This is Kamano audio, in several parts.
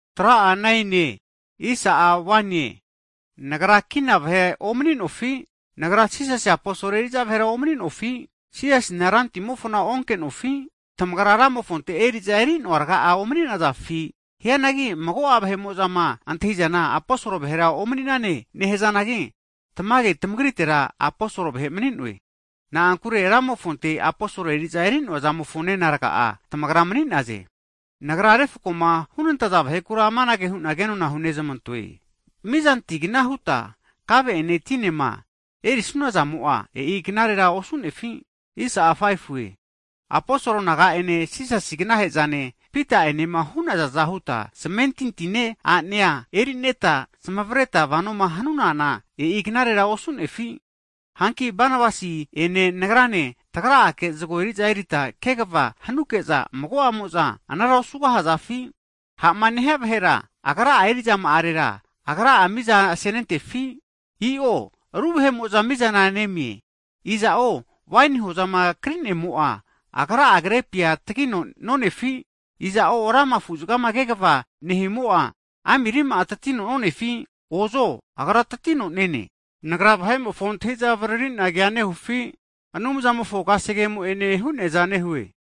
Hagi nagra kina vahe omani'nofi? Nagra Jisasi aposol eri'za vahera omani'nofi? Jisasina Rantimofona onke'nofi? Tamagra Ramofonte eri'za eri'noa raga'a omani'nazafi? Hianagi mago'a vahe'mo'zama antahi'zana aposol vahera omani'ne nehazanagi, tamage tamagritera aposol vahe nagra mani'noe. Na'ankure Ramofonte aposol eri'za eri'noa zamofo nena raga'a tamagra mani'naze. Nagra refkoma hunantaza vahekura amanage hu'na kenona hunezmantoe. Mizantigna huta kave ene tinema erisuna zamo'a, e'i knarera osu'nefi? Aposol naga'ene Jisasi aganahe'zane Pita'enema hu'nazaza huta zmentintine a'nea eri'neta, zmavareta vanoma hanunana, e'i knarera osu'nefi? Hanki, Banabasi'ene nagrane tagra'ake zago eri'za erita kegava hanuke'za, mago'amo'za anara osugahazafi? Ha'ma nehia sondia vahera, agra'a eri'zama'arera, agra'a miza senentefi? I'o ru vahe'mo'za mizana nemize. Iza'o waini hozama kri'nemo'a, raga'a krepia tagino nonefi? Iza'o sipisipi afuzaga kegava nehimo'a, ami rima'a tatino nonefi? Ozo agra tatino nene. Nagra vahe antahi'za avaririna kea nehufi? Anumzamofo kasegemo'ene hu'neaza nehue.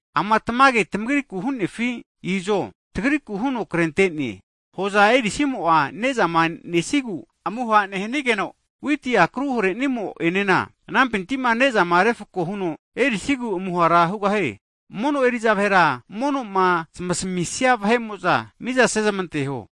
Ama tamage tagriku hu'nefi? Izo, tagriku huno krente'ne, hoza erisimo ne'zama nesigu amuhara nehanigeno, witi akru hare'nimo enena anampinti'ma ne'zama refko huno erisigu amuhara hugahie. Mono eri'za vahera, mono'ma zamasamisaza vahe'mo'za, miza sezmanteho.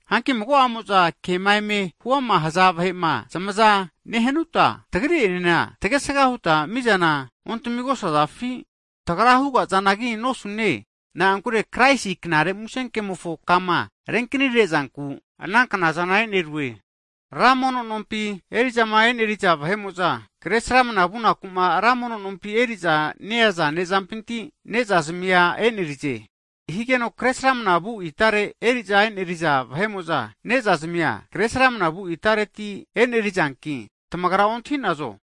Hanki mago'amo'za kema eme huama haza ruga'a vahe'ma zamaza nehanuta, tagri'enena tagesga huta mizana ontamigosazafi? Tagra hugazanagi nosune. Na'ankure Kraisi Knare Musenkemofo kama renkni rezanku anaknaza e'nerue. Ra mono nompima eri'zama e'neriza vahe'mo'za, kresramana vunaku ra mono nompi eri'za neaza ne'zampinti, ne'zazmia e'nerize. Ana hanige'za kre sramnavu itare eri'za e'neriza vahe'mo'za, ne'za zmia Kresramana vu itareti e'nerizanki tamagra ontahi'nazo?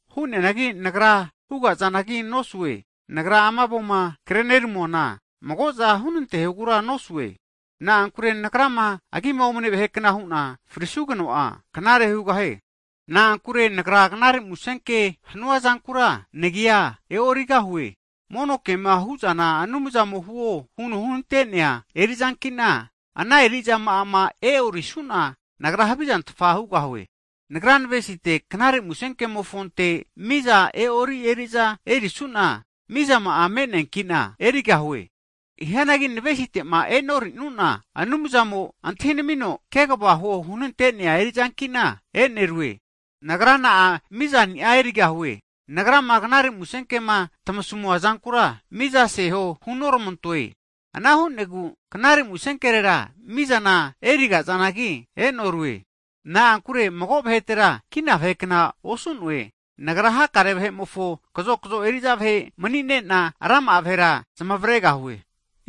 Hu'neanagi nagra hugazanagi nosue. Nagra ama avoma kreneramuana, mago'za hunantehogura nosue. Na'ankure nagrama agi omane vahekna hu'na frisugeno'a, knare hugahie. Na'ankure nagra Knare Musenke hanuazankura nagia e'origahue. Mono kema hu'zana Anumzamo huo huno hunante'nea eri'zanki'na ana eri'zama e'orisuna nagra havizantfa hugahie. Nagra navesite'ma Knare Musenkema huama'ma nehusimpaga mizani'a erusine. Hianagi nagra navesitera e'noruanki Anumzamo antahinamino, kegava huo hunante'nea eri'zanki'na e'nerue. Nagra na'a mizani'a erigahue? Nagrama Knare Musenkema tmasamua zankura miza seho hunormantoe, ana hu'negu Knare Musenkerera mizana eriga'zanagi e'norue. Na'ankure mago vahetera kina vahekna osu'noe, nagra hakare vahe'mofo kazokzo eri'za vahe mani'ne'na, rama'a vahera zamavregahue.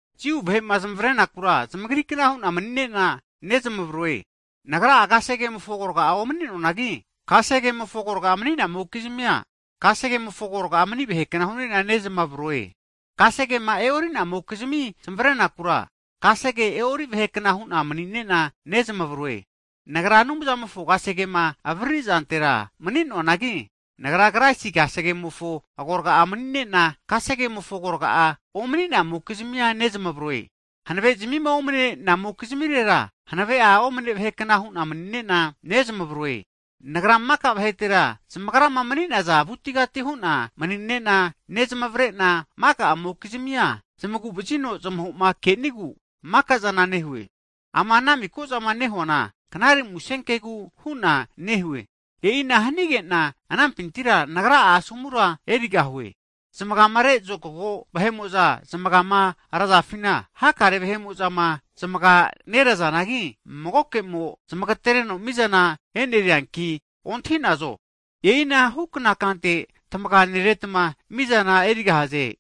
Jiu vahe'ma zmavarenakura zamagrikna hu'na mani'ne'na nezmavroe, nagra'a kasegemofo agorga omani'noanagi, kasegemofo agorga mani namokizmia, kasegemofo agorga mani vahe kna hu'ne'na nezmavroe. Kasegema e'ori namokizmima zmavrenakura, kasege e'ori vahe kna hu'na mani'ne'na nezmavaroe. Nagra Anumzamofo kasegema avariri zantera mani'noanagi, nagra Kraisi kasegemofo agorga'a mani'nena, kasegemofo agorga'a omani'namokizmi nezmavroe. Hanavezimi omne'nemokizmirera, hanaveni'a omne vahe kna hu'na mani'ne'na nezmavroe. Nagra maka vahetera zamagrama mani'naza avutigati hu'na mani'ne'na nezmavre'na, mago'amokizmia zmagu'vazino zmaho'ma kenigu mika'zana nehue. Ama ana miko'zama nehuana, Knare Musenkegu hu'na nehue. E'ina hanige'na anampintira nagra'a asomura erigahue. Zmagare zokago vahe'mo'za zmagama razafina, hakare vahe'mo'za zmaga nerazanangi, magoke'mo zamagatereno mizana e'nerianki ontahi'nazo? E'ina hukna kante tamaganeretma mizana erigahaze.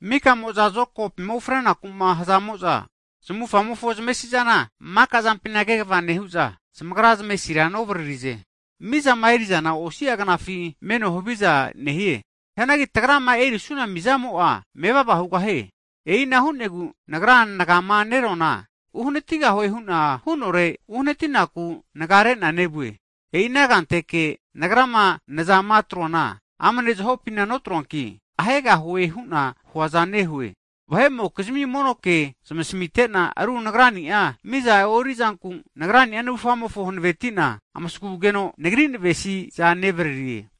Mika'mo'za zokagopima ufrenaku'ma hazamo'za, zamufamofo zamesizana maka'zampina kegava nehu'za, zamagra zamesi'zana novaririze. Mizama eri'zana osiagnafi meno haviza nehie. Hianagi tagrama erisuna mizamo'a mevava hugahie. E'ina hu'negu nagrama nagama neroana, uhanatigahue hu'na hu'nore uhanatinaku nagare'na nevue. E'inahu kanteke nagrama nazama atroana, amne zahopina notroanki, ahegahue hu'na huazana nehoe. Vahe'mokizmi mono ke zmasamite'na, ru nagrani'a miza e'orizanku, nagrani'a navufga hanaveti'na amasagugeno, nagri navesi'za nevaririe.